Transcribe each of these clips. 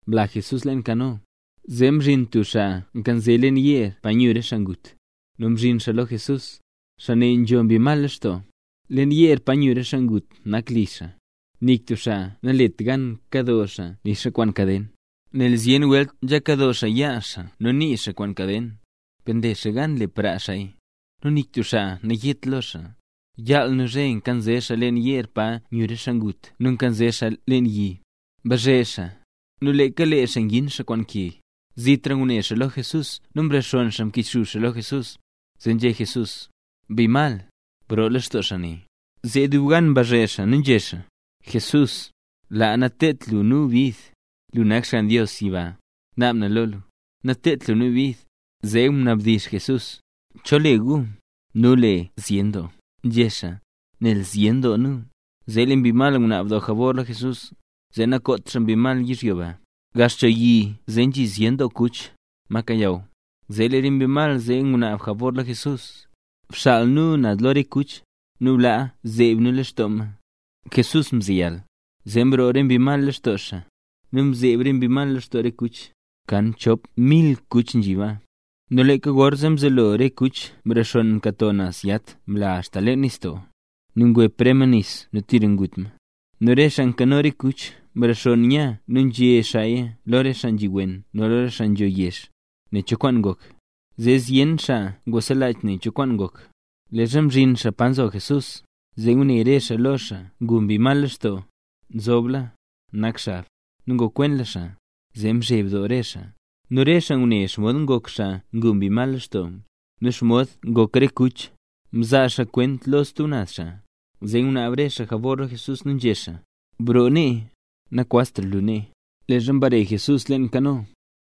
mla Jesús leen kano. Zee mzhin tub xaa nkanze leen yeer, pa nyu re xaa ngut, nu mzhin xaa lo Jesús. Xaa ne nzho mbi mal lextoo. Leen yeer pa nyu re xaa ngut nak li xaa. Nik tub xaa nalet gan kado xaa nixa kwaan kaden. Nel zyen welt nzha kado xaa yaa xaa nu nii xaa kwaan kaden, per nle xaa gan nle praa xaaya; nu nik tub xaa nayet lo xaa. Yaal nu zhe nkanze xaa leen yeer pa nyu re xaa ngut nu nkanze xaa leen yi. Mbazhe xaa, nu leeka lee xaa ngin xaa kwaan ke. Zitra ngune xaa lo Jesús nu mrexonn xaa mkichxub xaa lo Jesús. Zee nzhé Jesús: —Mbi mal, broo lextoo xaa ne. Zee dub gan mbazhe xaa nzhé xaa: —Jesús. ¡Laa, nateedt lu nu bid! ¡Lu nak Xgann Dios yiba! Naab na lo lu, nateedt lu nu bid. Zee mnabdizh Jesús: —¿Cho le gu? —Nu le Zyen Doo —nzhé xaa—, nel zyen doo nu. Zee lee re mbi mal ngunaab doo jabor lo Jesús, zee nakoot xaa mbi mal yizhyo ba. Gax cho yi zee nzhi zyen kuch, ma kayaw. Zee lee re bi mal zee ngunaab jabor lo Jesús: —Bxaal nu naz lo re kuch, nu blaa zeeb nu lextoo ma. Jesús mzeyal. Zee mroo re mbi mal lextoo xaa, nu mzeeb re mbi lextoo re kuch, kan chop mil kuch nzhi baa. Nu leeka gorzee mzelo re kuch mrexonn mkato naz yat mla axta leen nistoo. Nu ngwep re ma nis nu tira ngut ma. Nu re xaa nkano re kuch mrexonn nya nu nzhé xaaya lo re xaa nzhi wen nu lo re xaa nzho yezh, nen cho kwaan ngok. Zee zyen xaa ngwaselach nen cho kwaan ngok. Leezha mzhin xaa pa nzo Jesús, zee ngune re xaa lo xaa ngu mbi mal lextoo; nzobla, nak xab, nu ngokwenla xaa, zee mzheb doo re xaa. Nu re xaa ngune xomod ngok xaa ngu mbi mal lextoo, nu xomod ngok re kuch, mzaa xaa kwenta lo stub naz xaa. Zee ngunaab re xaa jabor lo Jesús nu nzhé xaa: —Broo nee, nakwaztra lu nee. Leezha mbare Jesús leen kano,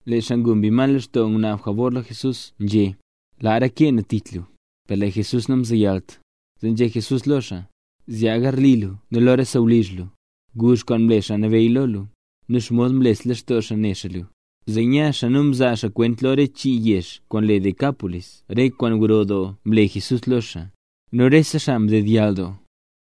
lee xaa ngu mbi mal lextoo ngunaab xaa jabor lo Jesús, nzhé: —Laa reke na tich lu. Per lee Jesús namzeyalt, zee nzhé Jesús lo xaa: —Zyaa garli lu nu lo re sawlizh lu, guzh kwaan mle Xaa Nabeyy lo lu, nu xomod mles lextoo xaa ne xaa lu. Zee nya xaa, nu mzaa xaa kwenta lo re chii yezh kwaan le Decápolis re kwaan gro doo mle Jesús lo xaa. Nu rese xaa mdedyall doo.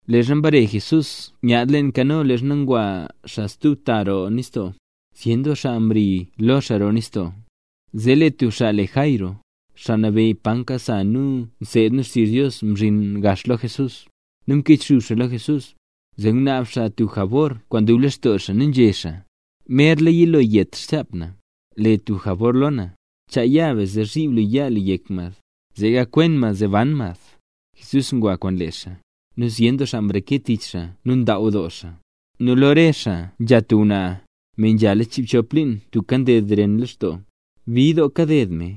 Leezha mbare Jesús nyaad leen kano, leezha ngwa xaa stub ta roo nistoo, zyen doo xaa mri lo xaa roo nistoo. Zee lee tub xaa le Jairo, xaa nabeyy pa nkasa nu nseed nu xtizh Dios, mzhin gax xaa lo Jesús, nu mkichxub xaa lo Jesús. Zee ngunaab xaa tub jabor kwaan dub lextoo xaa, nu nzhé xaa: —Merla yilo yet xchap na. Le tub jabor lo na, chaa ya be zee zhiib lu yaa lu yek mad, zee gakwen mad zee ban mad. Jesús ngwa kwaan lee xaa. Nu zyen doo xaa mreke tich xaa nu ndaaw doo xaa. Nu lo re xaa nzha tub ngwnaa, me nzhala chiibchop liin tubka nded ren lextoo. Bid doo kaded me.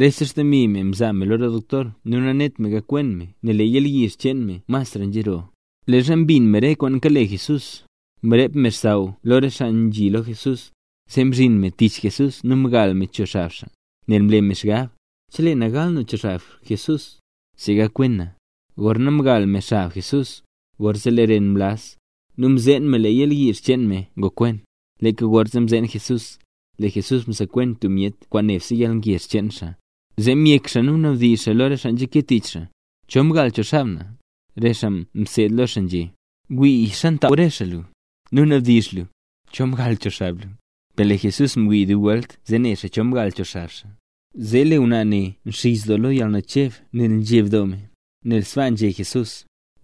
Rese xdemi me mzaa me lo re doktor nu nanet me gakwen me, nel lee yalyizh cheen me masra nzharoo. Leezha mbin me re kwaan kale Jesús, mrep me xsaww lo re xaa nzhi lo Jesús, zee mzhin me tich Jesús, nu mgal me cho xab xaa, nel mle me xgab: “Chelee na gal na cho xab Jesús, zee gakwen na”. Gorna mgal me xab Jesús, gorzee lee ren mlaz, nu mzeen me lee yalyizh cheen me ngokwen. Leeka gorzee mzeen Jesús, lee Jesús msekwen tub myet kwaan nebse yalngezh cheen xaa, zee myek xaa nu mnabdizh xaa lo re xaa nzhake tich xaa: —¿Cho mgal cho xab na? Re xaa mseed lo xaa nzhé: —Wii, ntaaw re xaa lu, nu mnabdizhra lu: “¿Cho mgal cho xab na?” Per lee Jesús mwii dub welt zee ne xaa cho xaa mgal cho xab xaa. Zee lee ngwnaa ne nxizh doo lo yalnacheb nel mzheb doo me, nel sbaa nzhé Jesús.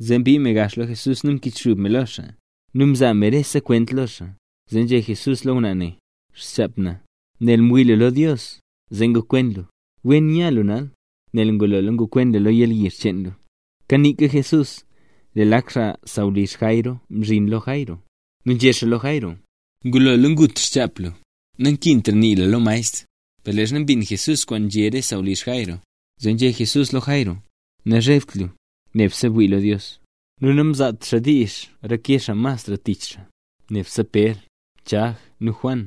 Zee mbii me gax lo Jesús nu mkichxub me lo xaa, nu mzaa me rese kwent lo xaa. Zee nzhé Jesús lo ngwnaa ne: —Xchap na. Nel mwii lu lo Dios, zee ngokwen lu. Wen nya lu nal, nel ngulola ngokwen lu yalyizh cheen lu. Kaniika Jesús, lee lak xaa sawlizh Jairo mzhin lo Jairo. Nu nzhé xaa lo Jairo: —Ngulola ngut xchap lu, nankintra nii lu lo maestr. Per leezha mbin Jesús kwaan nzhé re sawlizh Jairo, zee nzhé Jesús lo Jairo: —Nazhebt lu, nebse bwii lo Dios. Nu namzaat xaa diizh reke mas xaa tich xaa, nebse Pér, Chag nu Juan,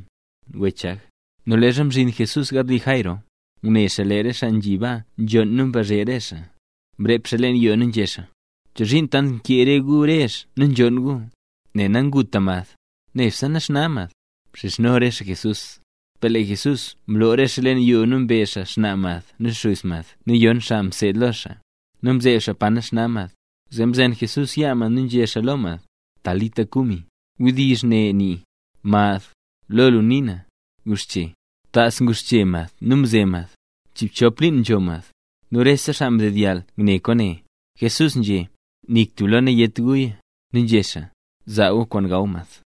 wech Chag. Nu leezha mzhin Jesús garli Jairo, ngune xaa lee re xaa nzhi baa nzhonn nu mbazhe re xaa. Mrep xaa leen yoo nu nzhé xaa: —¿Chozhiin tant nkee gu rezh nu nzhonn gu? Nel nanguta mad, nebse naxna mad. Mxizhno re xaa Jesús. Per lee Jesús mloo re xaa leen yoo nu mbe xnaa mad nu xuz mad nu yon xaa mseed lo xaa, nu mzeeb xaa pa nax mad. Zee mzen Jesús yaa mad nu nzhé xaa lo mad: —Talita kumi. (Wdizh ne nii: “Mad, ¡guxche!”) Tas nguxche mad nu mze mad; chiibchop liin nzho mad. Nu rese xaa mdedyall ngune kwaane. Jesús nzhé: —Nik tub lo nayét guya. Nu nzhé xaa: —Zaa gu kwaan gaw mad.